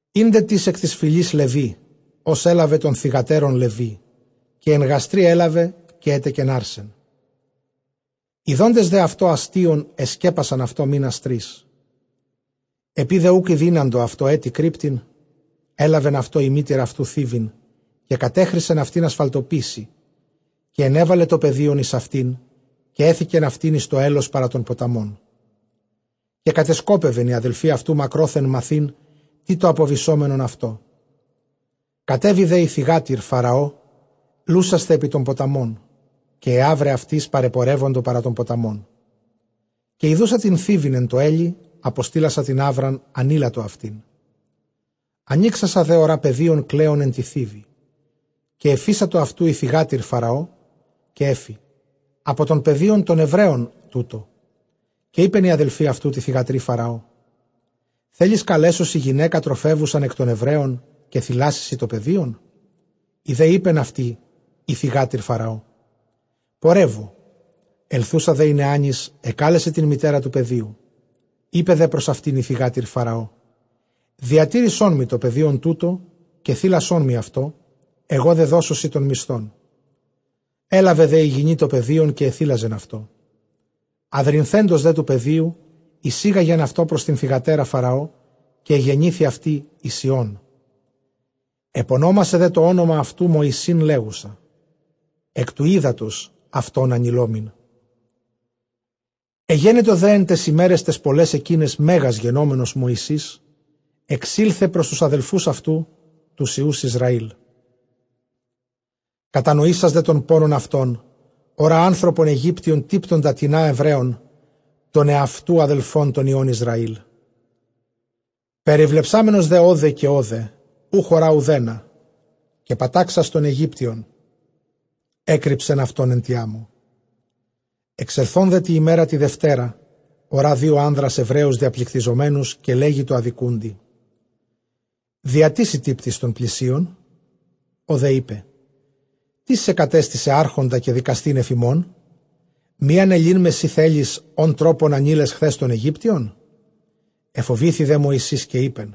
Ἦν δέ τις ἐκ τῆς φυλῆς Λευὶ, ὃς ἔλαβεν τῶν θυγατέρων Λευί. Καὶ ἐν γαστρὶ ἔλαβε, καὶ ἔτεκεν ἄρσεν· ἰδόντες δὲ αὐτὸ ἀστεῖον, ἐσπέπασαν αὐτὸ μῆνας τρεῖς. Ἐπεὶ δὲ οὐκ ἐδύναντο αὐτὸ ἔτι κρύπτειν, ἔλαβεν αὐτῷ ἡ μήτηρ αὐτοῦ θῖβιν, καὶ κατέχρισεν αὐτὴν ἀσφαλτοπίσσῃ, καὶ ἐνέβαλε τὸ παιδίον εἰς αὐτήν, καὶ ἔθηκεν αὐτὴν εἰς τὸ ἕλος παρὰ τὸν ποταμόν. Καὶ κατεσκόπευεν ἡ ἀδελφὴ αὐτοῦ μακρόθεν, μαθεῖν τί τὸ ἀποβησόμενον αὐτῷ. Κατέβη δὲ ἡ θυγάτηρ Φαραὼ λούσασθαι ἐπὶ τὸν ποταμὸν, καὶ αἱ ἅβραι αὐτῆς παρεπορεύοντο παρὰ τὸν ποταμόν· καὶ ἰδοῦσα τὴν θίβιν ἐν τῷ ἕλει, ἀποστείλασα τὴν ἅβραν, ἀνείλατο αὐτήν. Ἀνοίξασα δὲ ὁρᾷ παιδίον κλαῖον ἐν τῇ θίβει· καὶ ἐφείσατο αὐτοῦ ἡ θυγάτηρ Φαραὼ, καὶ ἔφη, ἀπὸ τῶν παιδίων τῶν Ἐβραίων τοῦτο. Καὶ εἶπεν ἡ ἀδελφὴ αὐτοῦ τῇ θυγατρὶ Φαραὼ, θέλεις καλέσω σοι γυναῖκα τροφεύουσαν ἐκ τῶν Ἐβραίων, καὶ θηλάσει σαι τὸ παιδὶον σοι τὸ παιδίον; Ἡ δὲ εἶπεν ἡ θυγάτηρ Φαραὼ, πορεύου· ἐλθοῦσα δὲ νεᾶνις ἐκάλεσε τὴν μητέρα τοῦ παιδίου. Εἶπεν δὲ πρὸς αὐτὴν ἡ θυγάτηρ Φαραὼ, διατήρησόν μοι τὸ παιδίον τοῦτο, καὶ θήλασόν μοι αὐτὸ, ἐγὼ δὲ δώσω σοι τὸν μισθόν· ἔλαβε δὲ ἡ γυνὴ τὸ παιδίον, καὶ ἐθήλαζεν αὐτό. Ἁδρυνθέντος δὲ τοῦ παιδίου, εἰσήγαγεν αὐτὸ πρὸς τὴν θυγατέρα Φαραὼ, καὶ ἐγενήθη αὐτῇ εἰς υἱόν· ἐπωνόμασε δὲ τὸ ὄνομα αὐτοῦ Μωυσῆν, λέγουσα, ἐκ τοῦ ὕδατος αὐτὸν ἀνειλόμην. Ἐγένετο δὲ ἐν ταῖς ἡμέραις ταῖς πολλαῖς ἐκείναις μέγας γενόμενος Μωυσῆς, ἐξῆλθε πρὸς τοὺς ἀδελφοὺς αὐτοῦ τοὺς υἱοὺς Ἰσραήλ· κατανοήσας δὲ τὸν πόνον αὐτῶν, ὁρᾷ ἄνθρωπον Αἰγύπτιον τύπτοντα τινὰ Ἐβραῖον, τῶν ἑαυτοῦ ἀδελφῶν τῶν υἱῶν Ἰσραήλ. Περιβλεψάμενος δὲ ὧδε καὶ ὧδε οὐχ ὁρᾷ οὐδένα, καὶ πατάξας τὸν Αἰγύπτιον, ἔκρυψεν αὐτὸν ἐν τῇ ἄμμῳ. Ἐξελθὼν δὲ τῇ ἡμέρᾳ τῇ δευτέρᾳ, ὁρᾷ δύο ἄνδρας Ἐβραίους διαπληκτιζομένους· καὶ λέγει τῷ ἀδικοῦντι, διὰ τί σὺ τύπτεις τὸν πλησίον; Ὁ δὲ εἶπε, τίς σε κατέστησεν ἄρχοντα καὶ δικαστὴν ἐφʼ ἡμῶν; μὴ ἀνελεῖν με σὺ θέλεις, ὃν τρόπον ἀνεῖλες χθὲς τὸν Αἰγύπτιον; ἐφοβήθη δὲ Μωυσῆς, καὶ εἶπεν,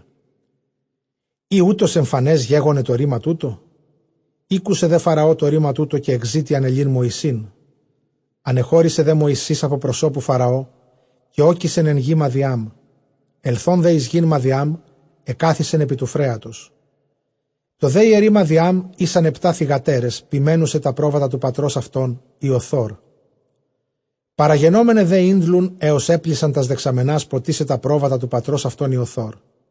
εἰ οὕτως ἐμφανὲς γέγονε τὸ ῥῆμα τοῦτο. Ἤκουσε δὲ Φαραὼ τὸ ῥῆμα τοῦτο, καὶ ἐζήτει ἀνελεῖν Μωυσῆν. Ἀνεχώρησε δὲ Μωυσῆς ἀπὸ προσώπου Φαραὼ, καὶ ᾤκησεν ἐν γῇ Μαδιάμ· ἐλθὼν δὲ εἰς γῆν Μαδιὰμ, ἐκάθισεν ἐπὶ τοῦ φρέατος. Τῷ δὲ ἱερεῖ Μαδιὰμ ἦσαν ἑπτὰ θυγατέρες, ποιμαίνουσαι τὰ πρόβατα τοῦ πατρὸς αὐτῶν Ἰοθόρ· παραγενόμεναι δὲ ἤντλουν, ἕως ἔπλησαν τὰς δεξαμενάς, ποτίσαι τὰ πρόβατα τοῦ πατρὸς αὐτῶν Ἰοθόρ.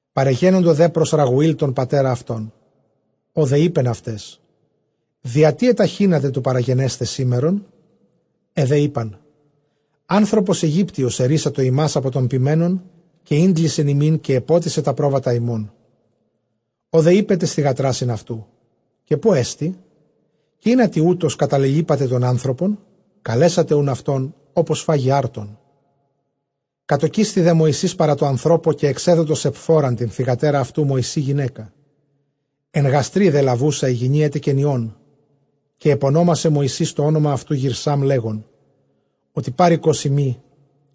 Παρεγένοντο δὲ πρὸς Ῥαγουὴλ τὸν πατέρα αὐτῶν· ὁ δὲ εἶπεν αὐταῖς, διατί ἐταχύνατε τοῦ παραγενέσθαι σήμερον; Αἱ δὲ εἶπαν, ἄνθρωπος Αἰγύπτιος ἐῤῥύσατο ἡμᾶς ἀπὸ τῶν ποιμένων, καὶ ἤντλησεν ἡμῖν, καὶ ἐπότισε τὰ πρόβατα ἡμῶν. Ὁ δὲ εἶπε ταῖς θυγατράσιν αὐτοῦ, καὶ ποῦ ἐστιν; καὶ ἱνατί καταλελοίπατε τὸν ἄνθρωπον; καλέσατε οὖν αὐτὸν, ὅπως φάγῃ ἄρτον. Κατῳκίσθη δὲ Μωυσῆς παρὰ τῷ ἀνθρώπῳ· καὶ ἐξέδοτο Σεπφώραν τὴν θυγατέρα αὐτοῦ Μωυσῇ γυναῖκα. Ἐν γαστρὶ δὲ λαβοῦσα ἡ γυνὴ ἔτεκεν υἱόν· καὶ ἐπωνόμασε Μωυσῆς τὸ ὄνομα αὐτοῦ Γηρσάμ, λέγων, ὅτι παροικός εἰμι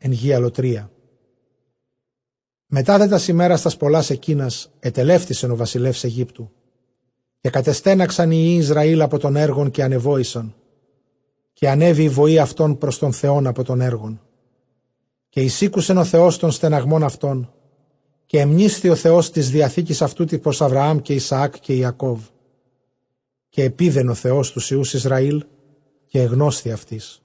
ἐν γῇ ἀλλοτρίᾳ. Μετὰ δὲ τὰς ἡμέρας τὰς πολλὰς ἐκείνας, ἐτελεύτησεν ὁ βασιλεὺς Αἰγύπτου, καὶ κατεστέναξαν οἱ υἱοὶ Ἰσραὴλ ἀπὸ τῶν ἔργων, καὶ ἀνεβόησαν· καὶ ἀνέβη ἡ βοὴ αὐτῶν πρὸς τὸν Θεὸν ἀπὸ τῶν ἔργων. Καὶ εἰσήκουσεν ὁ Θεὸς τὸν στεναγμὸν αὐτῶν· καὶ ἐμνήσθη ὁ Θεὸς τῆς διαθήκης αὐτοῦ τῆς πρὸς Ἀβραὰμ, καὶ Ἰσαὰκ, καὶ Ἰακώβ. Καὶ ἐπεῖδεν ὁ Θεὸς τοὺς υἱοὺς Ἰσραὴλ, καὶ ἐγνώσθη αὐτοῖς.